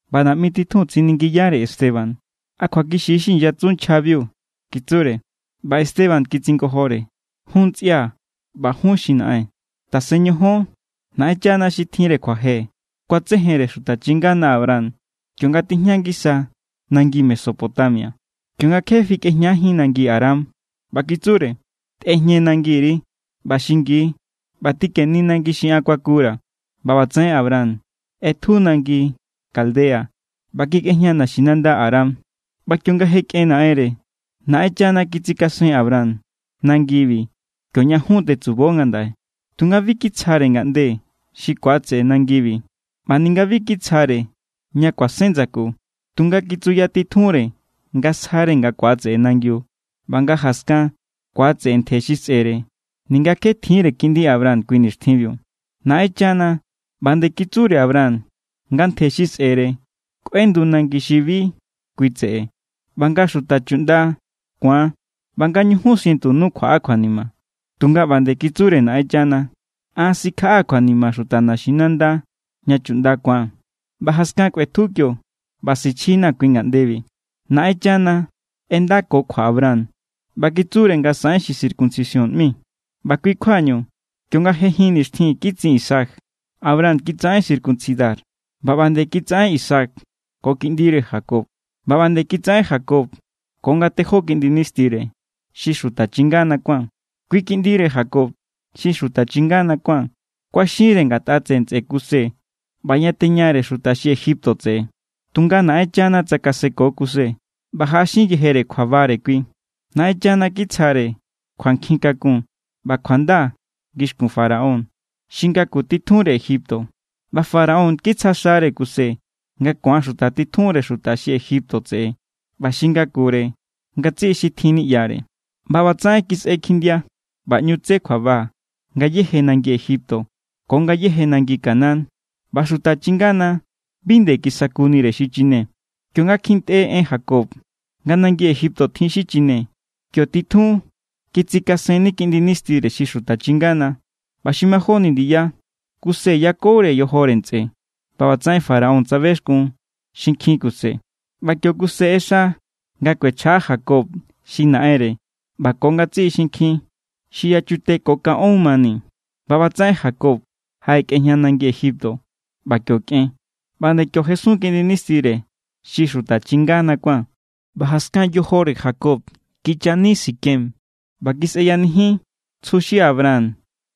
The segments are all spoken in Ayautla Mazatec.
ꞌBa naꞌmi titjun tsiningiyare Esteban: —¿A kjuakixi= xi inyatsu nchjabiu? —kitsure. ꞌBa Esteban kitsingojore: —Jún ntsꞌia̱ ꞌba jun xi naꞌen, tasen ñojon. Naꞌenchana xi tjinre kjuaje kuatsejenre xuta chingana Abraham kionga tijña ngisa nangi Mesopotamia, kionga kje fikꞌejñajín nangi Haran. ꞌBa kitsure: “Tꞌejñe nangiri ꞌba xingi ꞌba tikeni nangi xi an kuakura̱.” ꞌBa ꞌbatsaꞌen Abraham ꞌetju nangi Caldea ꞌba kikꞌejña naxinanda Haran. ꞌBa kionga je kꞌen naꞌenre, Naꞌenchana kitsikasen Abraham nangibi kioña jun tetsubo ngandaꞌe. Tunga bi kitsjare ngaꞌnde xi ku̱atseꞌe nangibi, ꞌba ninga bi kitsjare ña kuasen ndsaku. Tunga kitsuya titjunre nga sjare nga ku̱atseꞌe nangiu ꞌba nga jaskan ku̱atseꞌe ntje xi sꞌe̱re, ninga kje tjiínre kiꞌndi Abraham kui nixtjinbiu. Naꞌenchana ꞌba nde kitsure Abraham nga ntje xi sꞌe̱re kꞌuendu nangi xi bi kui tseꞌe, ꞌba nga xuta chuꞌnda ku̱an, ꞌba nga ñujun sientu nu kjuaꞌa kjuanima. Tunga ꞌba nde kitsure Naꞌenchana: “An sikjaꞌaa̱ kjuanima xuta naxinanda ña chuꞌnda ku̱an, ꞌba jaskan kꞌuetju kio ꞌba sichjina̱ kui ngaꞌndebi.” ’Naꞌenchana ꞌendako kjua Abraham ꞌba kitsure nga saꞌen xi circuncisión ꞌmi. ꞌBa kui= kjuañu, kionga je jin nixtjin kitsin Isaac, Abraham kitsaꞌen circuncidar. ꞌBa ꞌba nde kitsaꞌen Isaac ko kiꞌndire Jacob. ꞌBa ꞌba nde kitsaꞌen Jacob ko ngatejó kiꞌndi nistire, xi xuta chingana kuán. ’Kui kiꞌndire Jacob, xi xuta chingana kuán, kuaxinre ngatꞌa tseꞌe ntsꞌe Kuse ꞌba yateñare xuta xi Egipto tseꞌe. Tunga Naꞌenchana tsakaseko Kuse ꞌba jaꞌaxin yejere kjuabare kui. Naꞌenchana kitsjare kjuankjin kakun ꞌba kjuanda ngixkun Faraón xi ngaku titjunre Egipto. ꞌBa Faraón kitsja xare Kuse nga ku̱an xuta titjunre xuta xi Egipto tseꞌe ꞌba xi ngakure ngatsiꞌi xi tjin niꞌyare. ’ꞌBa ꞌbatsaꞌen kisꞌe kjindia ꞌba ꞌñu tse kjuaba ngayéje nangi Egipto ko ngayéje nangi Canaán, ꞌba xuta chingana bi nde kisakunire xi chine. Kionga kjintꞌe en Jacob nga nangi Egipto tjin xi chine, kio titjun kitsikasenni kiꞌndi nistire xi xuta chingana. ꞌBa xi majóni ndiya, Kuse yakure yojore ntsꞌe. ꞌBa ꞌbatsaꞌen Faraón tsabexkun xinkjin Kuse. ꞌBa kio Kuse ꞌexa nga kuechjaꞌa Jacob xi naꞌenre ꞌba ko ngatsiꞌi xinkjin xi yachute ko kanꞌón mani. ꞌBa ꞌbatsaꞌen Jacob jaꞌekꞌejña nangi Egipto, ꞌba kio kꞌen. ꞌBa nde kio jesun kiꞌndi nistire xi xuta chingana kuán. ꞌBa jaskan yojore Jacob kichani Siquem, ꞌba kiseyanijin tsju xi Abraham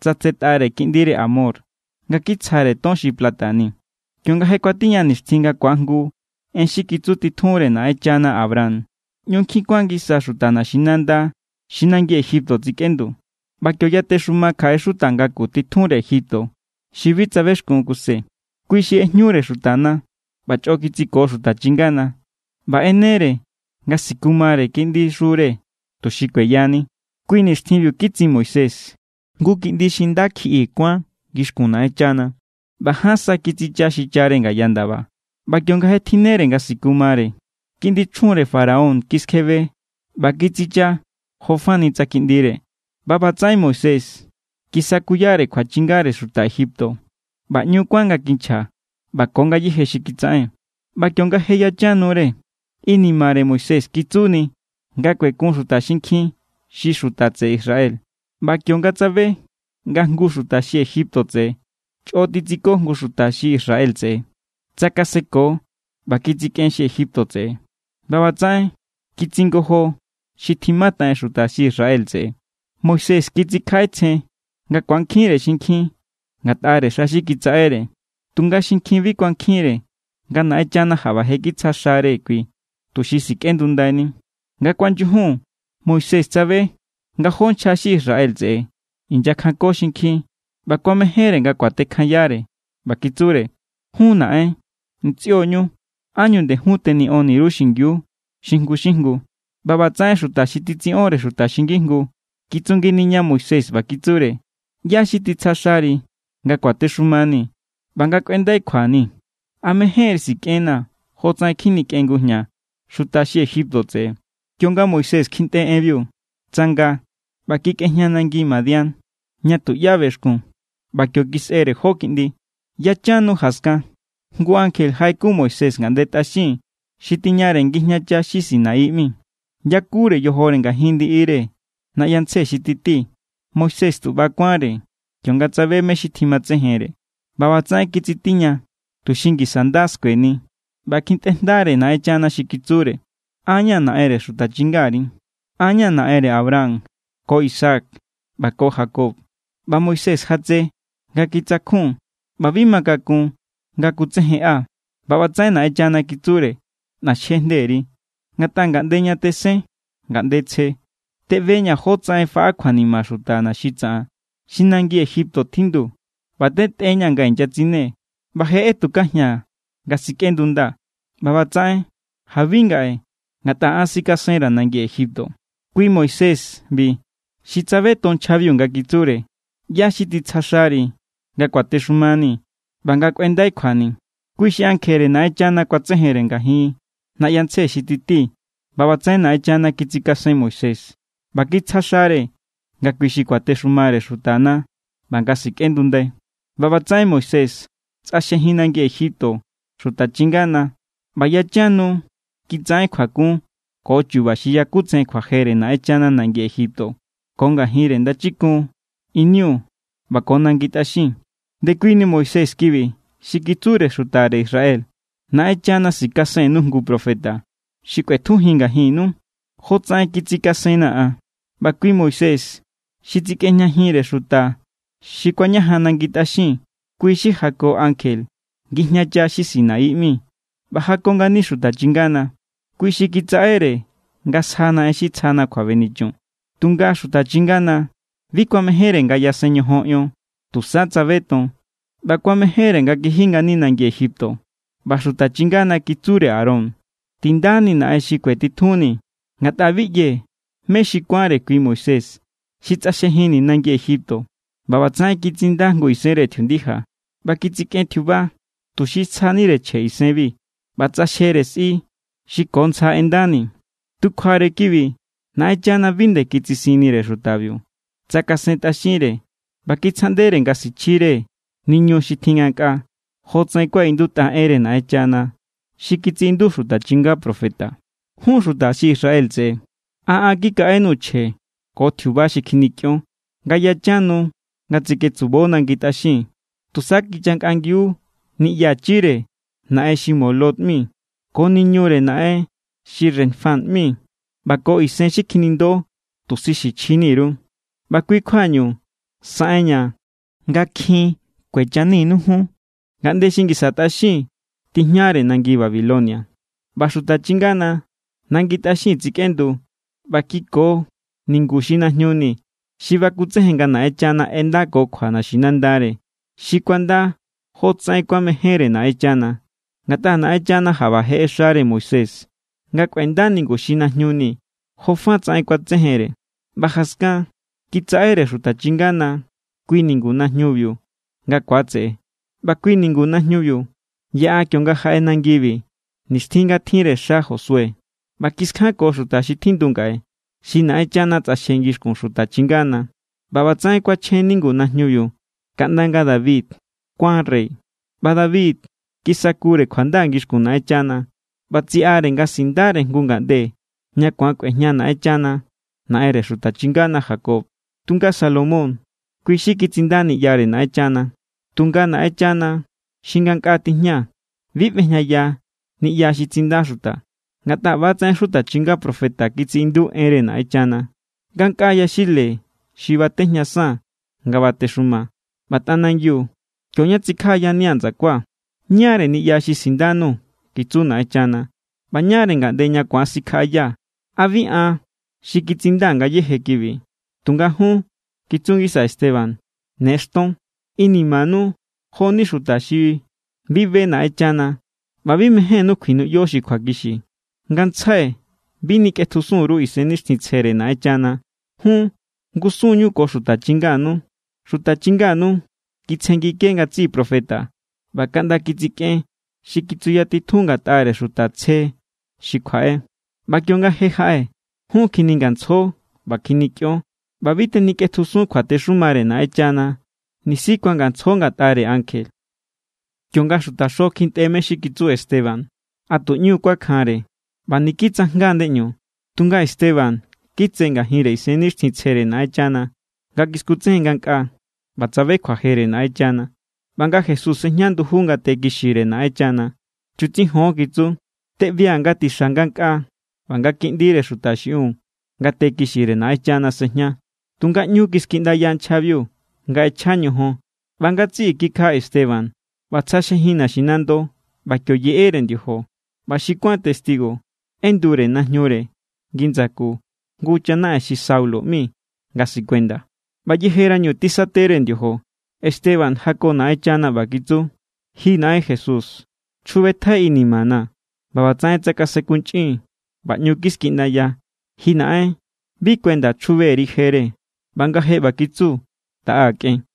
tsatsetꞌare kiꞌndire Hamor nga kitsjare ton xi plata ni. ’Kionga je kuatiña nixtjin nga kuajngu en xi kitsu titjunre Naꞌenchana Abraham, ꞌñu nkjin kuan ngisa xuta naxinandana xi nangi Egipto tsikꞌendu. ꞌBa kio yatexuma kjaꞌe xuta ngaku titjunre Egipto xi bi tsabexkun Kuse. Kui xi ꞌejñure xutana ꞌba chꞌo kitsiko xuta chingana. ꞌBa ꞌenere nga sikumare kiꞌndixure, tuxi kueyani. ’Kui nixtjinbiu kitsin Moisés. Jngu kiꞌndi xi nda kjiꞌi kuán ngixkun Naꞌenchana, ꞌba ján sa kitsicha xichare ngaya ndaba. ꞌBa kionga je tjinnere nga sikumare, kiꞌndi chjunre Faraón kiskjebe ꞌba kitsicha jo fani tsa kiꞌndire. ꞌBa ꞌbatsaꞌen Moisés kisakuyare kjuachjinere xuta Egipto, ꞌba ꞌñu kuán nga kinchja ꞌba ko ngayéje xi kitsaꞌen. ’ꞌBa kionga je yachan nure, inimare Moisés kitsuni nga kuekun xuta xinkjin, xi xuta tseꞌe Israel. ꞌBa kionga tsabe nga jngu xuta xi Egipto tseꞌe chꞌo titsiko jngu xuta xi Israel tseꞌe, tsakaseko ꞌba kitsikꞌen xi Egipto tseꞌe. ꞌBa ꞌbatsaꞌen kitsingojo xi tjimataꞌen xuta xi Israel tseꞌe. Moisés kitsikjaꞌetsjen nga ku̱ankjinre xinkjin ngatꞌare xa xi kitsaꞌere. Tunga xinkjin bi kuankjinre nga Naꞌenchana jaꞌba je kitsja xare kui, tuxi sikꞌendundaini. ’Nga kuanyujun Moisés tsabe nga jó nchja xi Israel tseꞌe inyakjanko xinkjin ꞌba kuamejénre nga kuatekjanyare. ꞌBa kitsure: “Jun, naꞌen, ntsꞌio ñu. ¿Ánñu nde jun teniꞌoni_ru xingiu xi jngu= xi jngu?” ꞌBa ꞌbatsaꞌen xuta xi titsiꞌonre xuta xi ngijngu kitsunginiña Moisés ꞌba kitsure: “¿ꞌYá= xi titsja xari nga kuatexumanii̱ ꞌba nga kꞌuendai kjuani̱? ¿A mejénri sikꞌennaa̱ jotsaꞌen kjinikꞌen ngujña xuta xi Egipto tseꞌe?” Kionga Moisés kjintꞌe enbiu, tsanga ꞌba kikꞌejña nangi Madián, ña tuꞌyá bexkun. ꞌBa kio kisꞌere jó kiꞌndi. ’Yachan nu jaskan, jngu ankje jaꞌekun Moisés ngaꞌnde tꞌaxin xi tiñare ngijñacha xi Sinaí ꞌmi. Yakure yojore ngajin ndiꞌire naꞌyantsje xi titi. Moisés tu ꞌba= kuánre kionga tsabe mé= xi tjimatsejenre. ꞌBa ꞌbatsaꞌen kitsitiña tuxi ngisa nda skueni. ꞌBa kjintꞌere jndare Naꞌenchana xi kitsure: “An= ña̱ Naꞌenre xuta chingari, an ña̱ Naꞌenre Abraham ko Isaac ꞌba ko Jacob.” ꞌBa Moisés jatse nga kitsakjun ꞌba bi ma kakun nga kutsejenꞌa. ꞌBa ꞌbatsaꞌen Naꞌenchana kitsure: “ꞌNaxje jnderi, ngatꞌa ngaꞌnde ña tesen ngaꞌnde tsje. Teꞌbeña̱ jótsaꞌen faꞌa kjuanima xuta xi tsaꞌan xi nangi Egipto tjindu ꞌba tentꞌeña̱ nga inyatsine, ꞌba je ꞌetukajia̱n nga sikꞌendundaa̱. ꞌBa ꞌbatsaꞌen jabi ngaꞌe ngatꞌa an sikasenra̱ nangi Egipto.” ’Kui Moisés=bi xi tsabeton nchjabiu nga kitsure: “¿ꞌYá= xi titsja xari nga kuatexumanii̱ ꞌba nga kꞌuendai kjuani̱?”, kui xi ankjere Naꞌenchana kuatsejenre ngajin naꞌyantsje xi titi. ꞌBa ꞌbatsaꞌen Naꞌenchana kitsikasen Moisés ꞌba kitsja xare nga kui xi kuatexumare xutana ꞌba nga sikꞌendundai. ’ꞌBa ꞌbatsaꞌen Moisés tsꞌaxjejin nangi Egipto xuta chingana. ꞌBa yachan nu kitsaꞌen kjuakun ko chu̱ba̱ xi yakutsejen kjuajere Naꞌenchana nangi Egipto ko ngajinre Ndachikun Iniu ꞌba ko nangi tꞌaxin. Ndekuini Moisés kibi xi kitsure xutare Israel: “Naꞌenchana sikasennu jngu profeta xi kꞌuetjujin ngajinnu, jotsaꞌen kitsikasenna̱ an.” ꞌBa kui Moisés xi tsikꞌejñajinre xuta xi kuañajan nangi tꞌaxin. Kui xi jako ankje ngijñacha xi Sinaí ꞌmi ꞌba jako ngani xuta chingana. Kui xi kitsaꞌere nga sjana en xi tsjana kjuabenichun. ’Tunga xuta chingana, bi kuamejénre nga yasen ñojon ion. Tusa tsabeton ꞌba kuamejénre nga kiji ngani nangi Egipto. ꞌBa xuta chingana kitsure Aarón: “Tindanii̱ naꞌen xi kuetitjunni̱. Ngatꞌa bi ꞌyee̱ mé xi kuánre kui Moisés xi tsꞌaxjejinni̱ nangi Egipto.” ꞌBa ꞌbatsaꞌen kitsinda jngu isenre tjiundija, ꞌba kitsikꞌen tjiuba tuxi sjanire chje isenbi. ꞌBa tsꞌaxjere sꞌi xi ko ntsja ꞌendani. ’Tu kjuare kibi, Naꞌenchana bi nde kitsisinnire xutabiu. Tsakasentꞌaxinre ꞌba kitsjaꞌndere nga sichjire niñu xi tjin ngankꞌaa, jotsaꞌen kuaꞌindutꞌa enre Naꞌenchana xi kitsiꞌindu xuta chinga profeta: Jun xuta xi Israel tseꞌe, ¿a an kikaꞌenuu̱ chje ko tjiuba xi kjinikꞌion, nga yachan nu nga tseketsubo nangi tꞌaxin? Tusa kichankꞌangiu niꞌyachire naꞌen xi Moloc ꞌmi, ko niñure naꞌen xi Renfán ꞌmi, ꞌba ko isen xi kjinindo tuxi sichjini_ru. ꞌBa kui= kjuañu saꞌenña̱ nga kjin kuechaninu jun ngaꞌnde xi ngisa tꞌaxin tijñare nangi Babilonia. ’ꞌBa xuta chingana nangi tꞌaxin tsekꞌendu ꞌba kiko ningu xi najñu ni xi bakutsejen nga Naꞌenchana ꞌendakokjua naxinandare, xi kuanda jotsaꞌen kuamejénre Naꞌenchana. Ngatꞌa Naꞌenchana jaꞌba je ꞌexare Moisés nga kꞌuenda ningu xi najñu ni jofa tsaꞌen kuatsejenre. ꞌBa jaskan kitsaꞌere xuta chingana kui ningu najñubiu nga ku̱atseꞌe. ꞌBa kui ningu najñubiu yaꞌa kionga jaꞌe nangibi, nixtjin nga tjinre xa Josué. ꞌBa kiskjanko xuta xi tjindu ngaꞌe, xi Naꞌenchana tsꞌaxje ngixkun xuta chingana. ꞌBa ꞌbatsaꞌen kuachjen ningu najñubiu kaꞌnda nga David kuán rey. ’ꞌBa David kisakure kjuanda ngixkun Naꞌenchana, ꞌba tsiꞌare nga sindare jngu ngaꞌnde ña ku̱an kꞌuejña Naꞌenchana, Naꞌenre xuta chingana Jacob. Tunga Salomón kui xi kitsinda niꞌyare Naꞌenchana. Tunga Naꞌenchana xi ngankꞌaa tijña bi ꞌbejñaya niꞌya xi tsinda xuta. Ngatꞌa ꞌbatsaꞌen xuta chinga profeta kitsiꞌindu enre Naꞌenchana: Ngankꞌaa yaxile xi batejñasaa̱n nga batexumaa̱. ꞌBa tꞌanangiu, kio= ña tsikjaꞌayania̱ ndsakua̱. ¿Ñáre niꞌya xi sindanuu̱?, kitsu Naꞌenchana. ¿ꞌBa ñáre ngaꞌnde ña ku̱an sikjaꞌayaa̱? ¿A bi an xi kitsinda ngayéje kibi? ’Tunga jun —kitsu ngisa Esteban—, ne xton. Inimanu jo=ni xuta xi bi be Naꞌenchana ꞌba bi mejénnú kjuinuꞌyo xi kjuakixi. Ngantsjai bi nikꞌetjusun_ru Isennixtjintsjere Naꞌenchana. Jun ngusunñu ko xuta chinganu. Xuta chinganu kitsjenngike ngatsiꞌi profeta ꞌba kaꞌnda kitsikꞌen xi kitsuyatitjun ngatꞌare xuta tsje xi kjuaꞌe. ꞌBa kionga je jaꞌe, jun kjiningantsjo ꞌba kjinikꞌion. ꞌBa bi tenikꞌetjusun kjuatexumare Naꞌenchana nisi kuangantsjo ngatꞌare ankje. Kionga xutaxo kjintꞌe mé= xi kitsu Esteban, a tu ꞌñu= kuakjanre ꞌba niki tsajnga ndeꞌñu. Tunga Esteban, kitse ngajinre Isennixtjintsjere Naꞌenchana nga kiskutsejen ngankꞌaa, ꞌba tsabe kjuajere Naꞌenchana ꞌba nga Jesús sejña nduju ngate kixire Naꞌenchana. —¡Chutsijon! —kitsu—. Teꞌbia̱ nga tixa ngankꞌaa ꞌba nga Kiꞌndire Xuta xiꞌin ngate kixire Naꞌenchana sꞌejña. Tunga ꞌñu kiskjiꞌndaya nchjabiu nga ꞌechja ñojon, ꞌba ngatsiꞌi kikjaꞌa Esteban. ꞌBa tsꞌaxjejin naxinando ꞌba kio yeꞌere ndiojo. ꞌBa xi kuán testigo ꞌendure najñure ngi ndsaku jngu chanaꞌen xi Saulo ꞌmi nga sikuenda. ꞌBa yejerañu tisatere ndiojo, Esteban jako Naꞌenchana ꞌba kitsu: —Ji Naꞌen Jesús, chjubetjai inimana̱. ꞌBa ꞌbatsaꞌen tsakasenkunchꞌin ꞌba ꞌñu kiskjiꞌndaya: —Ji Naꞌen, bi kuenda chjube_ri jere. ꞌBa nga je ꞌba kitsu, taꞌa kꞌen.